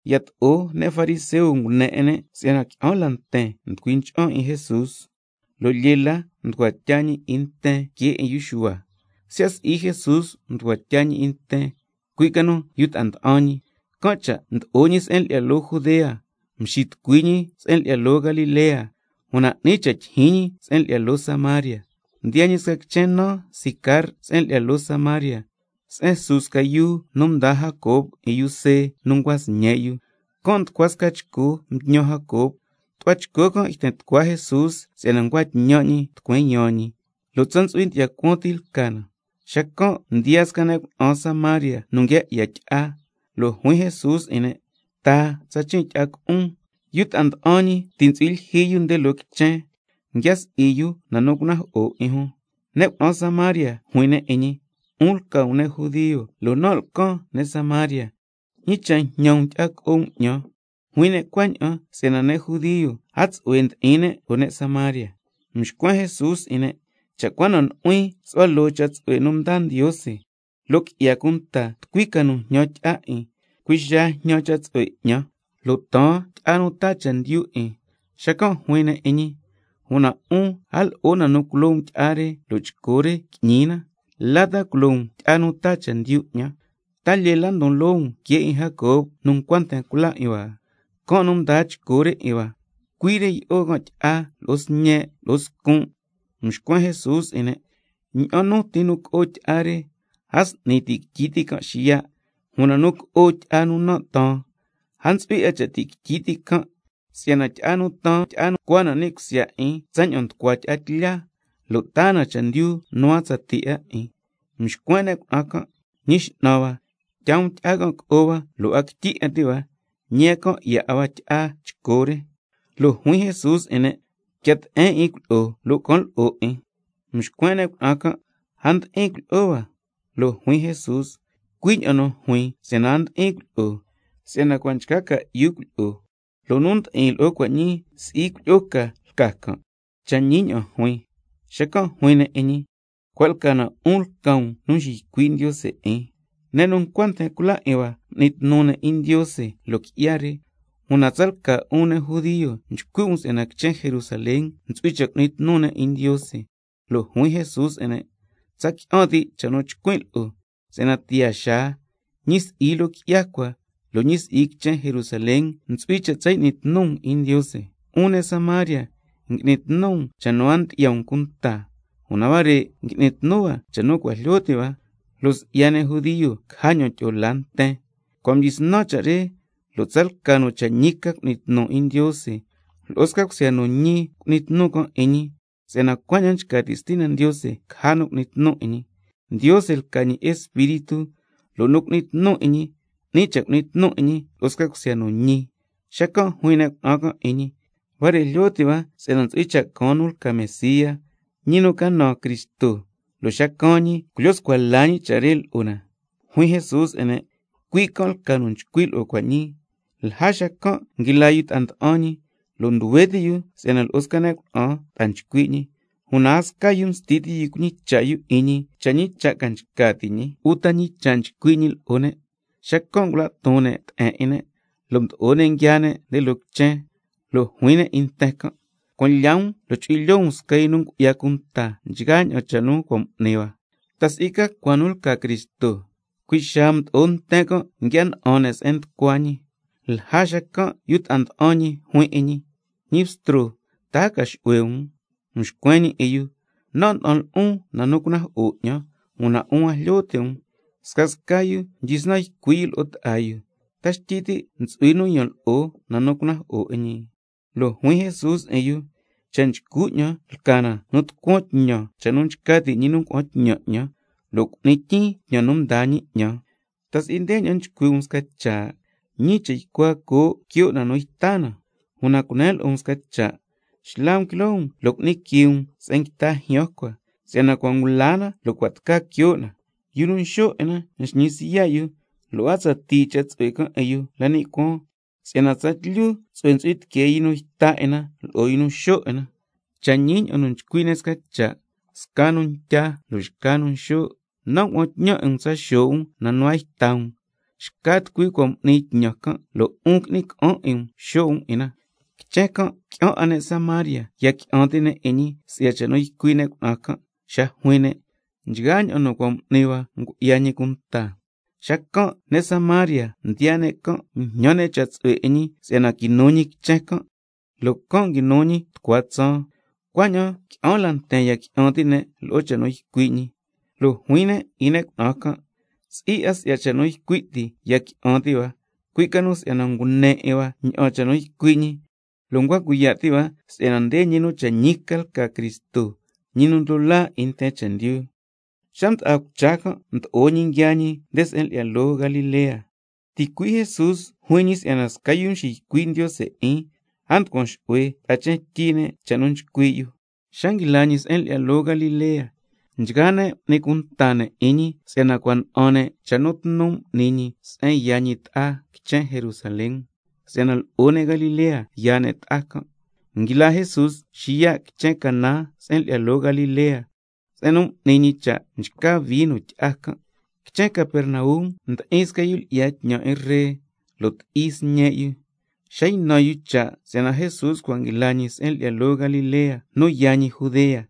Yato'o ne' fariseo ngune 'in ne' si'yana qui'an la nten nducui ncha'an 'in Jesús, lo' lyee la nducua tya ñi 'in nten que 'in yu Xuhua, (siya' si'i Jesús nducua tya ñi 'in nten, cui' ca nu yu ta'a nda'an ñi). Can' cha' mdo'o ñi se'en lyi'ya loo Judea, mxitucui ñi nde se'en lyi'ya loo Galilea, una 'ni cha' tyijyin ñi se'en lyi'ya loo Samaria. Mdiyaa ñi sca quichen naan Sicar se'en lyi'ya loo Samaria, se'en su sca yuu nu mdaa Jacob 'in yu See nu ncua sñe' yu. Can' nducua sca chco mtñan Jacob, tu'hua chco can' yten tucua Jesús si'yana ncua tñan' ñi tucueen yaan ñi, lo' tsa ntsu'hui ndyi'ya cuaan ti lca na. Xacan' mdiyaa sca ne' cuna'an Samaria nu nguia 'ya tyi'a, lo' juin Jesús 'in ne': Taa tsachin' tyi'a co'on. Yu ta'a nda'an ñi ti' ntsu'hui lyijyi yu nde loo quichen, nguia si'i yu na nu cunajo'o 'in jun. Ne' cuna'an Samaria juin ne' 'in ñi: 'Un lca um ne' judio lo' nan' lcan ne' Samaria, ¿ñi cha' njñan um tyi'a co'o um 'ñan? Juin ne' cuaña'an si'yana ne' judio a tsu'hue ndi'in ne' lo'o ne' Samaria. Mxcuen Jesús 'in ne': Cha' cua na nu'huin su'hua loo cha' tsu'hue nu ndaa Ndiose, lo' qui'ya cunta tucui ca nu njñan tyi'a 'in, cui' xaa jñan cha' tsu'hue 'ñan, lo' taan tyi'a nu taa chendyu 'in. Xacan' juin ne' 'in ñi: Una 'un, a lo'o na nu culo um tyi'a re lo' chco re qui'ñi na. ¿La ta culo um tyi'a nu taa chendyu 'ñan? ¿Ta lyee la ndon loo um que 'in Jacob nu ncua nten cula 'in hua? Can' nu mdaa chco re 'in hua, cui' re yi'o can' tyi'a lo'o sñe' lo'o scun'. Mxcuen Jesús 'in ne': Ña'an nu ti nu co'o tyi'a re, a s'ni ti' quityi ti' can' xiya'. Una nu co'o tyi'a nu nan' taan, a ntsu'hui 'a cha' ti' quityi ti' can', si'yana tyi'a nu taan chcua na ni' cusya 'in tsaña'an nducua tyi'a tlya, lo' taa na chendyu nu a tsatii 'a 'in. Mxcuen ne' cuna'an can': Ñi x'nan hua, tyaa um tyi'a can' co'o hua, lo' a quityi 'a ti' hua, ñi a can 'ya 'a hua tyi'a chco re. Lo' juin Jesús 'in ne': Quia te'en 'in cuilyi'o lo' can lo'o 'in. Mxcuen ne' cuna'an can': A ndi'in cuilyi'o hua. Lo' juin Jesús: Cui' ña'an nu juin si'yana a ndi'in cuilyi'o, si'yana cua' nchca ca'yu cuilyi'o, lo' nu ndi'in lo'o cua' ñii si'i cuilyi'o ca lca can', cha' ñi ña'an juin lo'on. Xacan' juin ne' 'in ñi: Cua' lca na 'un lca um nu nxiycui' Ndiose 'in. Ne' nu ncua nten cula 'in hua m'ni tnu ne' 'in Ndiose loo qui'ya re, una tsalca 'un ne' judio nchcui' um si'yana quichen Jerusalén ntsu'hui cha' cu'ni tnu ne' 'in Ndiose. Lo' juin Jesús 'in ne': Tsa qui'an ti' cha' nu chcuin' lo'o, si'yana tiyaa xaa, ñi si'i loo qui'ya cua lo' ñi si'i quichen Jerusalén ntsu'hui cha' tsa y'ni tnu um 'in Ndiose. 'Un ne' Samaria, ngui'ni tnu um cha' nu a ndyi'ya um cunta, una huare' ngui'ni tnu hua cha' nu cua' jlyo ti' hua, lo' si'ya ne' judio caja ña'an tyi'o laa nten. Cua' ñii cua' mdyisnan cha' re, lo' tsalca nu cha' ñi ca cu'ni tnu 'in Ndiose, lo'o sca cusya nu ñi cu'ni tnu can' 'in ñi, si'yana cuaña'an nchca ti' Stina Ndiose caja nu cu'ni tnu 'in ñi. Ndiose lca ñi Espíritu, lo' nu cu'ni tnu 'in ñi, 'ni cha' cu'ni tnu 'in ñi lo'o sca cusya nu ñi. Xacan' juin ne' cuna'an can' 'in ñi: Huare' jlyo ti' hua si'yana ntsu'hui cha' caan nu lca Mesía, ñi nu ca naan Cristo, lo' xa caan ñi culyo scua la ñi cha' re lo'o na. Juin Jesús 'in ne': Cui' can' lca nu nchcui' lo'o cua' ñii. Lja xacan' nguila yu ta'a nda'an ñi, lo' nduhue ti' yu si'yana lo'o sca ne' cuna'an ta'a nchcui' ñi, una a sca yu msti ti' yu cuñicha' yu 'in ñi cha' ñi cha' ca nchca ti' ñi uta ñi cha' nchcui' ñi lo'o ne'. Xacan' ngula' ton ne' te'en 'in ne', lo' mdo'o ne' nguiaa ne' nde loo quichen, lo' juin ne' lo'o nten can': Cuan lya um lo' chu'hui lyoo um sca yu nu ngu'ya cunta nchgaa ña'an cha' nu cua' m'ni hua. ¿Ta si'i ca cua nu lca Cristo? Cui' xaa mdo'o nten can' nguia na'an ne' se'en nducua ñi. Lja xacan' yu ta'a nda'an ñi juin 'in ñi: Ñi Bstro, ¿ta a ca xu'hue um? Mxcuen ñi 'in yu: Nan' nda'an lo'on na nu cunajo'o 'ñan, una 'un a jlyo ti' um. Xacan' scasca yu mdyisnan nchcui' yu lo'o ta'a yu: ¿Ta xtyi ti' ntsu'hui nu yan lo'o na nu cunajo'o 'in ñi? Lo' juin Jesús 'in yu: Cha' nchcu 'ñan ca lca nu tucuan tñan cha' nu nchca ti' ñi nu ngua'an tñan 'ñan, lo' cu'nin tyiin tñan nu mdaa ñi 'ñan. ¿Ta si'i ndeña'an nchcui' um sca cha': Ñii cha jacua coo' quio' na nu yta na? Una cunen lo'o um sca cha', xla um quiloo um lo' cu'ni quii um se'en nguita jyaan cua, si'yana cua' ngula na lo' cua' tca quio' na. Yu nu nxo' 'in na nxñi siya' yu, lo' a tsatii cha' tsu'hue can' 'in yu la ni' cuaan, si'yana tsatlyu tsu'hue chu'hui tiquee yu nu yta 'in na lo'o yu nu nxo' 'in na. Cha' ñi ña'an nu nchcui' ne' sca cha': Sca nu ntya lo' xca nu nxo'. Nan' ngua'an tñan 'in um tsa xo' um na nu a yta um, xca tucui cua' m'ni tñan can' lo' 'un qui'ni ca'an 'in um xo' um 'in na. Quichen can' qui'an 'a ne' Samaria ya qui'an ti' 'in ñi, si'ya cha' nu ycui' ne' cuna'an can' xa juin ne': Nchgaa ña'an nu cua' m'ni hua ngu'ya ñi cunta. Xacan' ne' Samaria nu mdiyaa can' mjñan cha' tsu'hue 'in ñi si'yana quinu ñi quichen can', lo' can' nguinu ñi tucua tsaan. Cuaña'an qui'an la nten ya qui'an ti' ne' lo'o cha' nu ycui' ñi, lo' juin ne' 'in ne' cuna'an can': Si'i 'a si'ya cha' nu ycui' ti ya qui'an ti' hua, cui' ca nu si'yana ngune 'in hua ña'an cha' nu ycui' ñi, lo' ncua cuiya' ti' hua si'yana nde ñi nu cha' ñi ca lca Cristo, ñi nu ndlo laa 'in nten chendyu. Xa mda'a cucha can' mdo'o ñi nguiaa ñi nde se'en lyi'ya loo Galilea. Ticui' Jesús juin ñi si'yana sca yu nu nxiycui' Ndiose 'in, a nducuan xu'hue ta'a quichen tyi ne' cha' nu nchcui' yu. Xa nguila ñi se'en lyi'ya loo Galilea, nchgaa ne' m'ni cunta ne' 'in ñi si'yana cua' na'an ne' cha' nu tnu m'ni ñi se'en yaa ñi ta'a quichen Jerusalén, si'yana lo'o ne' Galilea yaa ne' ta'a can'. Nguila Jesús xiya' quichen Caná se'en lyi'ya loo Galilea, se'en nu m'ni ñi cha' mchca vino tyi'a can'. Quichen Capernaum ndi'in sca yu lyi'ya tñan 'in ree, lo' ti'i sca sñe' yu. Xa ynan yu cha' si'yana Jesús cua' nguila ñi se'en lyi'ya loo Galilea nu yaa ñi Judea,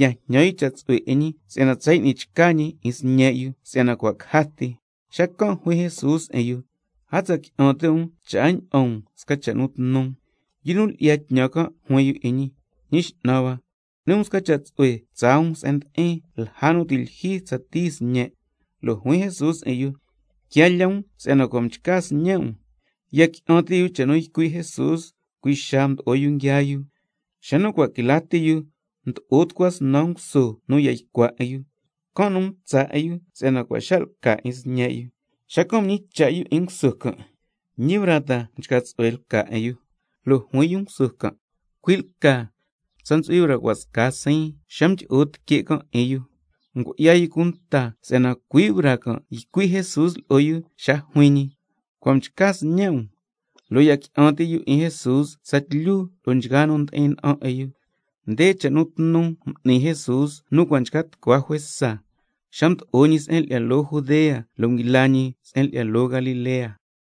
ya jñan yu cha' tsu'hue 'in ñi si'yana tsa y'ni chca ñi 'in sñe' yu si'yana cua' caja ti. Xacan' juin Jesús 'in yu: A tsa qui'an ti' um cha' a ña'an um sca cha' nu tnu. Yu nu lyi'ya tñan can' juin 'in ñi: Ñi X'nan hua, cu'ni um sca cha' tsu'hue tsaa um se'en ndi'in lja nu ti' lyijyi tsatii sñen'. Lo' juin Jesús 'in yu: Quia lya um si'yana cua' mchca sñe' um. Ya qui'an ti' yu cha' nu ycui' Jesús, cui' xaa mdo'o yu nguiaa yu. Xa nu cua' quila ti yu, mdo'o tucua snan nguso nu ya ycua 'in yu, can' nu mtsa' 'in yu si'yana cua' xa' lca 'in sñe' yu. Xacan' mñicha' yu 'in nguso can': ¿Ñi braa ta mchca tsu'hue lca 'in yu? Lo' juin yu nguso can': Cui' lca, tsa ntsu'hui braa cua' sca siin xa mdyi'o tique' can' 'in yu. Xacan' ngu'ya yu cunta si'yana cui' braa can' ycui' Jesús lo'o yu xa nu juin ñi: Cua' mchca sñe' um. Lo' ya qui'an ti' yu 'in Jesús tsatlyu lo'o nchgaa nu ndi'in na'an 'in yu. Nde cha' nu tnu m'ni Jesús nu cua' nchca tucua juesa, xa mdo'o ñi se'en lyi'ya loo Judea lo' nguila ñi se'en lyi'ya loo Galilea.